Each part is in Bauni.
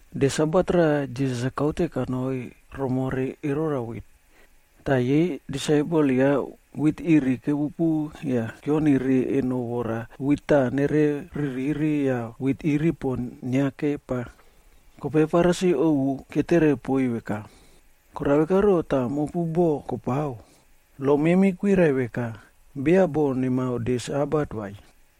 De Sabat raꞌa, Jisas-a kaute kanoi romore erora wit. Tah yei disaipel ya wit iri kepupu yah keononire eno yah wit taꞌa kere ririꞌri yah wit iri pon inia kepa. Kope Farisi ovu ketere poiy veka, “Korao vekaro tah mopu boꞌo kopao, lo memi kwirai veka beya boꞌo nemao de Sabat vai,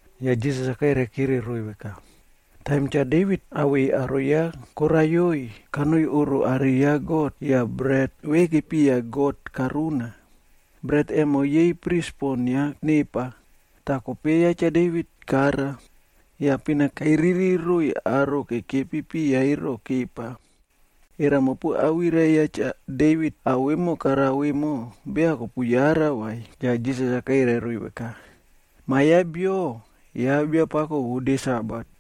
Yah Jisas-a kairai kire roiy veka, “Taim Cha Devit awei aro ya koraiyoi, kanoi oꞌro are ya God yah bret ve kepiya God karuna. Bret emo yei pris pon kuiniari nepa, toh kope ya Cha Devit kara. Yah pina kairiri roiy aro kekepi piya ero kepa. Era mopu awirai ya Cha Devit ao vemo karao emo, beya kopu yara, vai?” Yah Jisas-a kairai roiy veka, “Ma ya Bio, ya Biapako vo de Sabat.”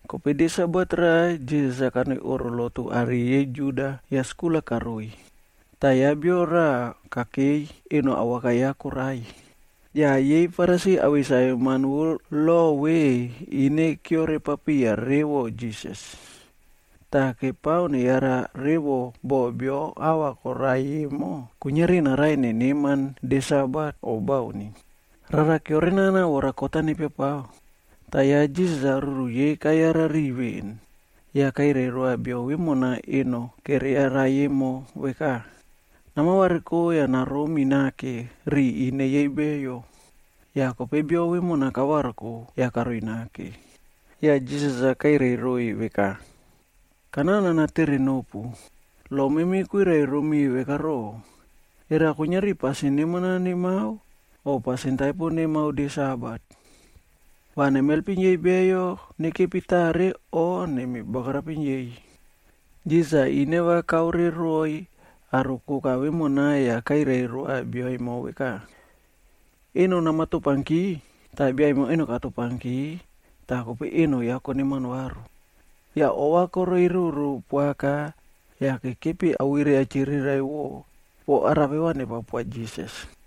Kope de Sabat raꞌa Jisas-a kanoi oꞌro lotu are yei Juda yah skul-a karoiy. Tah ya bio rava kakei, eno awaka ya korai. Yah yei Farisi awei saveman vo lob ve ine keore papiya revo Jisas. Tah kepao neyara revo boh beyo ahva koraiy emo, kuiniari naraiy neneman de Sabat o bauni. Rara keorenao vora kot-a nepiapao. Tah ya Jisas-a ruru yei kayara riꞌiy veꞌen. Yah kairai roa bio vemona eno keriarai emo veka, “Nama variko yah naromi nake riꞌiy ine yei beyo.” Yah kope bio vemona kavariko yah karoi nake. Yah Jisas-a kairai roiy veka, “Kanao nana tere nopu, lo memi kwirai romi veka roꞌo, era kuiniari pasin neman-a nemao o pasin taipo nemao de Sabat? Va nemi helpim yei beyo nekepi tare o nemi bagarapim yei?” Jisas-a ineva kaore roiy aro koka vemona yah kairai roa bia emo veka, “Eno nama topanki.” Tah biaemo eno katopanki tah kope eno ya koneman varu. Yah ova koreiyroro poaka yah kekepi awirai-a chiriraiꞌvo po arape va nepao poa Jisas.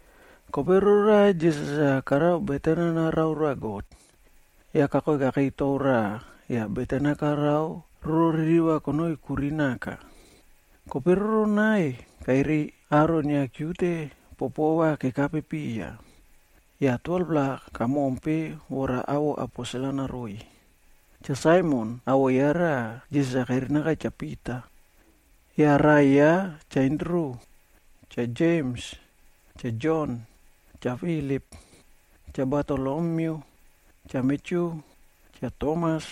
Kope rororaꞌa Jisas-a karao beten-a narao roa God, yah kakoi kakei tou raꞌa yah beten-a karao roro ririva konoi kuri naka. Kope roronai, kairiy aro inia kiute popova kekape piya, yah 12-pla yei kamompe yah awoꞌo aposelc karoiy: Cha Saimon, awoꞌo ya raꞌa, Jisas-a karinaka Cha Pita, yah raꞌai ya Cha Andru, Cha Jems, Cha Jon, Cha Filip, Cha Batolomyu, Cha Matyu, Cha Tomas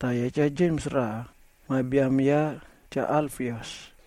tah ya Cha Jems raꞌa, ma biam ya Cha Alfias,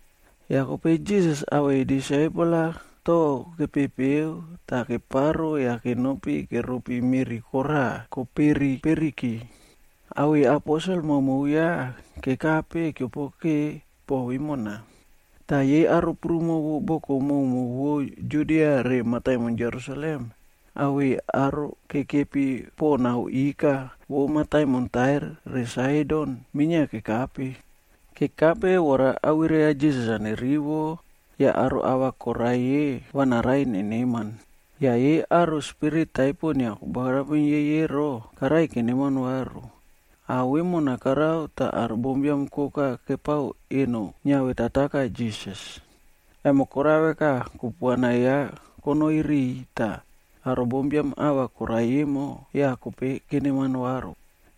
Yah kope Jisas awei disaipel-a tou kepepeo tah keparo yah kenopi keropi meꞌri koraꞌa koperi periki, awei disaipel maomao ya kekape keopokeke bo vemona. Tah yei aro prumo vo boko maomao vo Judia re mataimon Jerusalem awei aro kekepi poꞌo nao ikae vo mataimon Tair re Saidon minia kekape. Kekape vora awirai ya Jisas-a nerivo yah aro ahva koraiy-e va naraiy neneman. Yah yei aro spirit taipo inia kobagarapim yei ero, karaiy keneman varu. Ao vemona korao tah aro bombiam koka kepao eno niavetataka Jisas, emo korao veka, kupuana ya konoi riꞌiy tah aro bombiam ahva koraiy emo, yah kope keneman varu.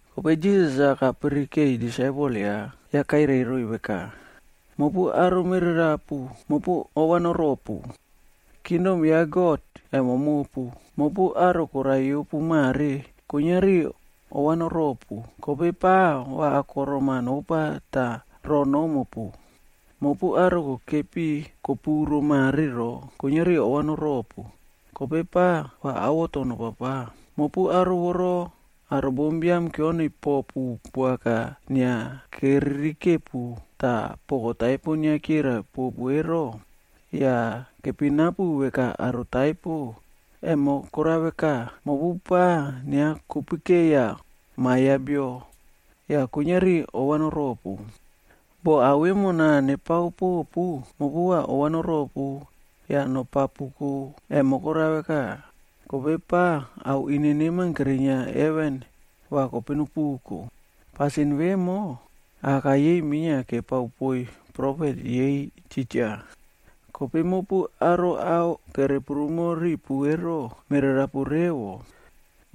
Kope Jisas-a kapirikei disaipel ya, yah kairai roiy veka, “Mopu aro mererapu, mopu ova noropu. Kingdom ya God, emo mopu. Mopu aro koraiyopu mare, kuiniari ova noropu kope pa va akorom-a nopa tah ro nomopu. Mopu aro kokepi kopuro mare ro, kuiniari ova noropu, kope pa va awoto nopapao. Mopu aro voro, aro bombiam kioniy popu poaka yah inia keririkepu tah poko taipo inia chirai popu ero, yah kepinapu veka aro taipo, emo korao veka, mopu pa inia kopikeiya Ma Biam ya Bio, yah kuiniari ova noropu. “Boh ao vemo nepao popu, mopu va ova noropu yah nopapuko, emo korao veka, kope pa ao ine neman kerinia heven va kope nopuko. Pasin vemo, aka yei minia kepao poiy profet yei titja. Kope mopu aro ao kere prumo ripu ero, mererapu revo.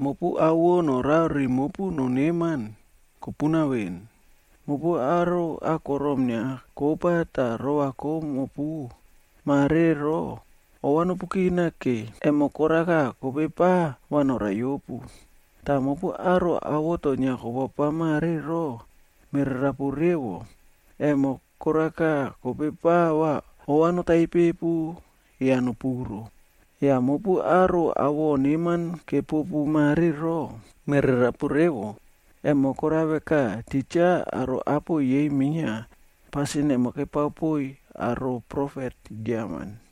Mopu ao vo norao riꞌi mopu noneman, kopuna veꞌen. Mopu aro akorom-a inia kopa tah rova komopu mare ro, ova nopu kinake, emo koraka kope pa va noraiyopu. Tah mopu aro awoto inia kopapao mare ro, mererapu revo, emo koraka kope pa va ova notaipepu yah nopuro. Yah mopu aro awoꞌo neman-a kepopu mare ro, mererapu revo, emo korao veka titja aro apo yei minia pasin emo kepao poiy aro profet giaman.”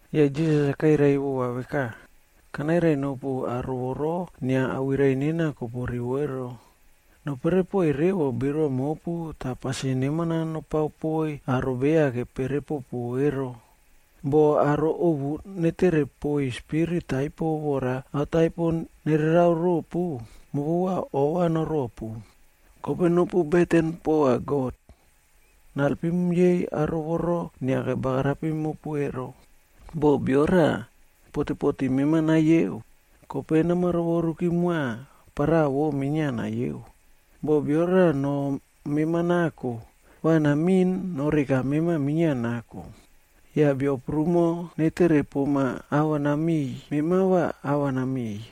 Yah Jisas-a kairai vova veka, “Kanairai nopu aro voro inia awirai nena kopu rivo ero, nopere poiy revo birua mopu tah pasin neman-a nopao poiy aro beya kepere popu ero. Boh aro ovu netere poiy spirit taipo vora ao taipo nererao ropu, mopu va ova noropu. Kope nopu beten poa God-a naelpim yei aro voro inia kebagarapim mopu ro. Boh bio raꞌa potepote mema nayeo, kope nama rovoruki moa paraꞌa vo minia nayeo. Boh bio raꞌa noh mema nako, va namiꞌin noreka mema minia nako. Yah beyo prumo netere poma ava namiꞌiy, mema va ava namiꞌiy.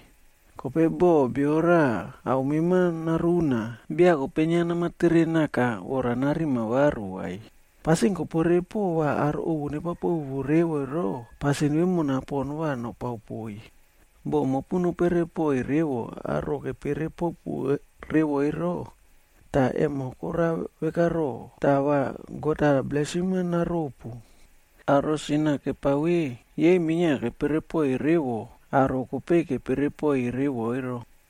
Kope boh bio raꞌa ao mema naruna, beya kope inia nama tere naka vora narima varu vai. Pasin kopere poꞌo va aro ovu nepao popu revo ero, pasin vemona pon va nopao poiy. “Boh mopu nopere poꞌoiy revo aro kepere popu revo ero, toh emo korao veka ro, tah va God-a blesim-a naropu? Aro sin-a kepao ve, yei minia kepere poꞌoiy revo aro kope kepere poiy revo ro.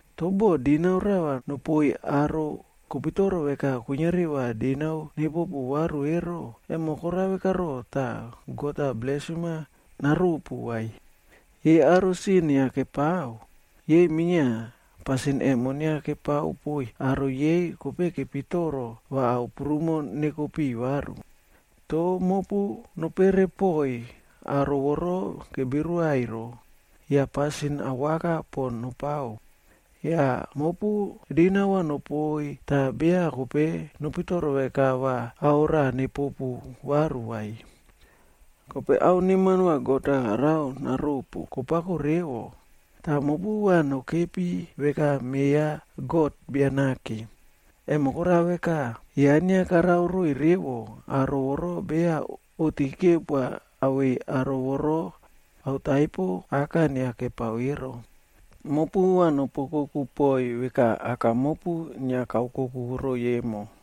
Toh boh dinau rava nopoiy aro kopitoro veka kuiniari va dinau nepopu varu ero, emo korao vekaro tah va God-a blesim-a naropu vai? Yei aro sin-a inia kepao, yei minia pasin emo inia kepao poiy aro yei kope kepitoro va ao prumo neko piꞌiy varu. Toh mopu nopere poꞌoiy aro voro kebirua ero, yah pasin awaka pon nopao. Yah mopu dinau va nopoiy tah beya kope nopitoro veka va ao rava nepopu varu vai. Kope ao neman va God-a karao naropu, kopako revo, tah mopu va nokepi veka me ya God Bia Nake. Emo korao veka, ya inia karao roiy revo aro voro beya oꞌti kepoa awei aro voro ao taipo aka inia kepao ero. Mopu va nopu oukoku poiy veka Aka mopu inia kaokoku roiy emo.”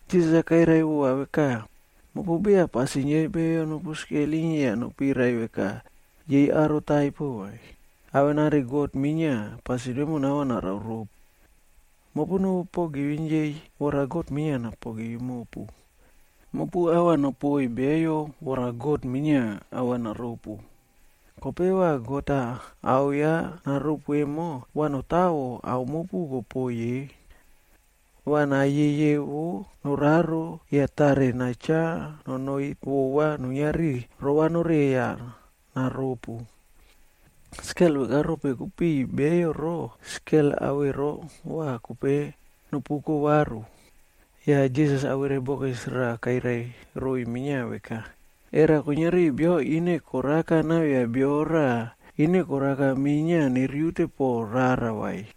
Jisas-a kairai vova veka, “Mopu beya pasin yei beyo nopu skelim yah nopirai veka yei aro taipo vai, avenari God minia pasin vemona va narao ropu. Mopu nopu pogivim yei, vora God minia napogivim mopu. Mopu ava nopoiy beyo vora God-a minia ava naropu. Kope va God-a ao ya naropu emo, va notawo ao mopu kopoiy ye, va nayeyevo noraro yah tare nachao nonoi vova kuiniari nowere yah naropu. Skel veka rope kopiꞌiy beyo ro, skel avero va kope nopuko varu.” Yah Jisas awirai bokis kairai roiy minia veka, “Era kuiniari bio ineva koraka navia bio raꞌa, ineva koraka minia neriute poꞌo rara vai?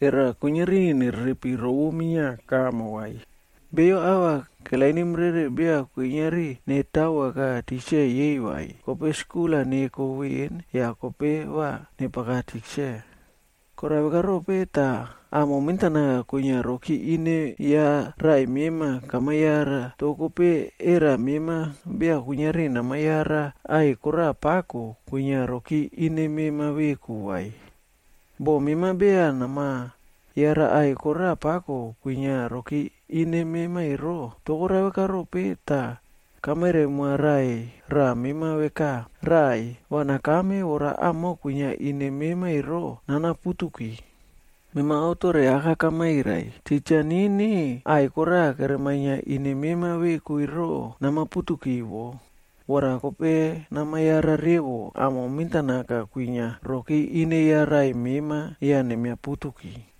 Era kuiniari nererepi rovo minia kamo, vai? Beyo ava kelainim rere beya kuiniari netawoaka tikse yei vai, kope skul-a neko veꞌen, yah kope va nepaka tikse. “Korao veka rope tah amo mentanaka kwinia rokire ine ya raꞌai mema kama yara, toh kope era mema beya kuiniari nama yara aꞌai koraꞌa pako kwinia rokire ine mema veku vai? Boh mema beya nama yara aꞌai koraꞌa pako kwinia rokire ine mema ero, toh korao veka rope tah kamairai moa raꞌai raꞌa mema veka, ‘Raꞌai, va nakame vora amo kwinia ine mema ero nana putuki.’ Mema aotore aka kamairai, titja nini aꞌai koraꞌa keremainia ine mema veku ero nama putuki wo, vora kope nama yara revo amo mentan aka kwinia rokire ine ya raꞌai mema yah nemiaputuki.”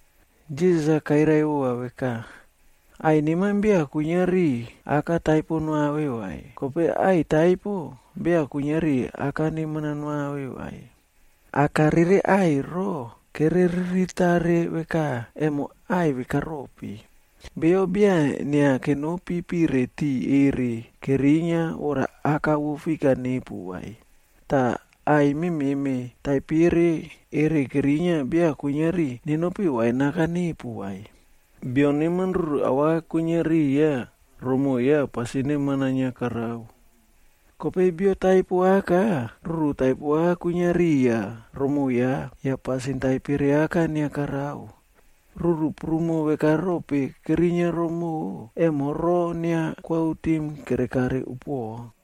Jisas-a kairai vova veka, “Aꞌai neman beya kuiniari aka taipo noave vai, kope aꞌai taipo, beya kuiniari aka neman-a noave vai. Aka rere aꞌai ro, kere riritare veka, emo aꞌai veka rope. Beyo beya inia kenopi pire tiꞌi erere kerinia vora aka vo fik-a nepu vai, tah aꞌai memeꞌme taipere erere kerinia beya kuiniari nenopi wain aka nepu vai. Bio neman ruru awaka kwinia riya romoꞌo ya pasin neman-a inia karao. Kope bio taipo aka, ruru taipo aka kwinia riya romoꞌo ya, yah pasin taipere aka inia karao. Ruru prumo veka rope kerinia romoꞌo, emo roo inia koautim kerekare upuoꞌo.”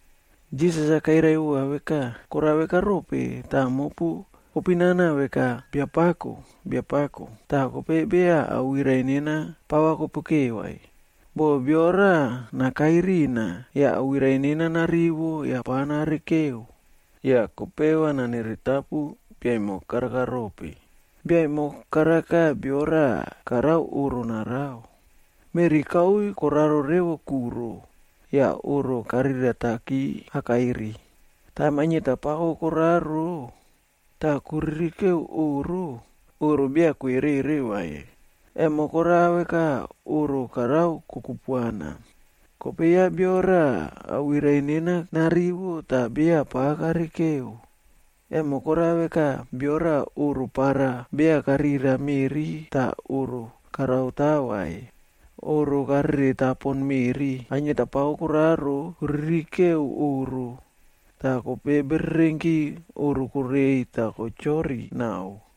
Jisas-a kairai vova veka, “Korao veka rope tah mopu kopinana veka, ‘Biapako, Biapako,’ tah kope beya awirai nena pava kopike vai? Boh bio rava nakai rina, yah awirai nena narivo yah pava narikeo, yah kope va naniritapu bia emo karaka rope. “Bia emo karaka bio raꞌa karao oꞌro narao. Meꞌri kauiy koraro revo kuro yah oꞌro karirataki akairi. Taim ainieta pako koraro tah kokirikeo oꞌro, oꞌro beya kwerere vai, emo korao veka oꞌro karao kokupuana. Kope ya bio raꞌa awirai nena narivo tah beya pa narike, emo korao veka bio raꞌa oꞌro para beya karira meꞌri tah oꞌro karaota vai. Oꞌro karereta pon meꞌri. Anieta pako koraro kokirikeo oꞌro, yah kope bererenki oꞌro korei tah kochori naꞌao.”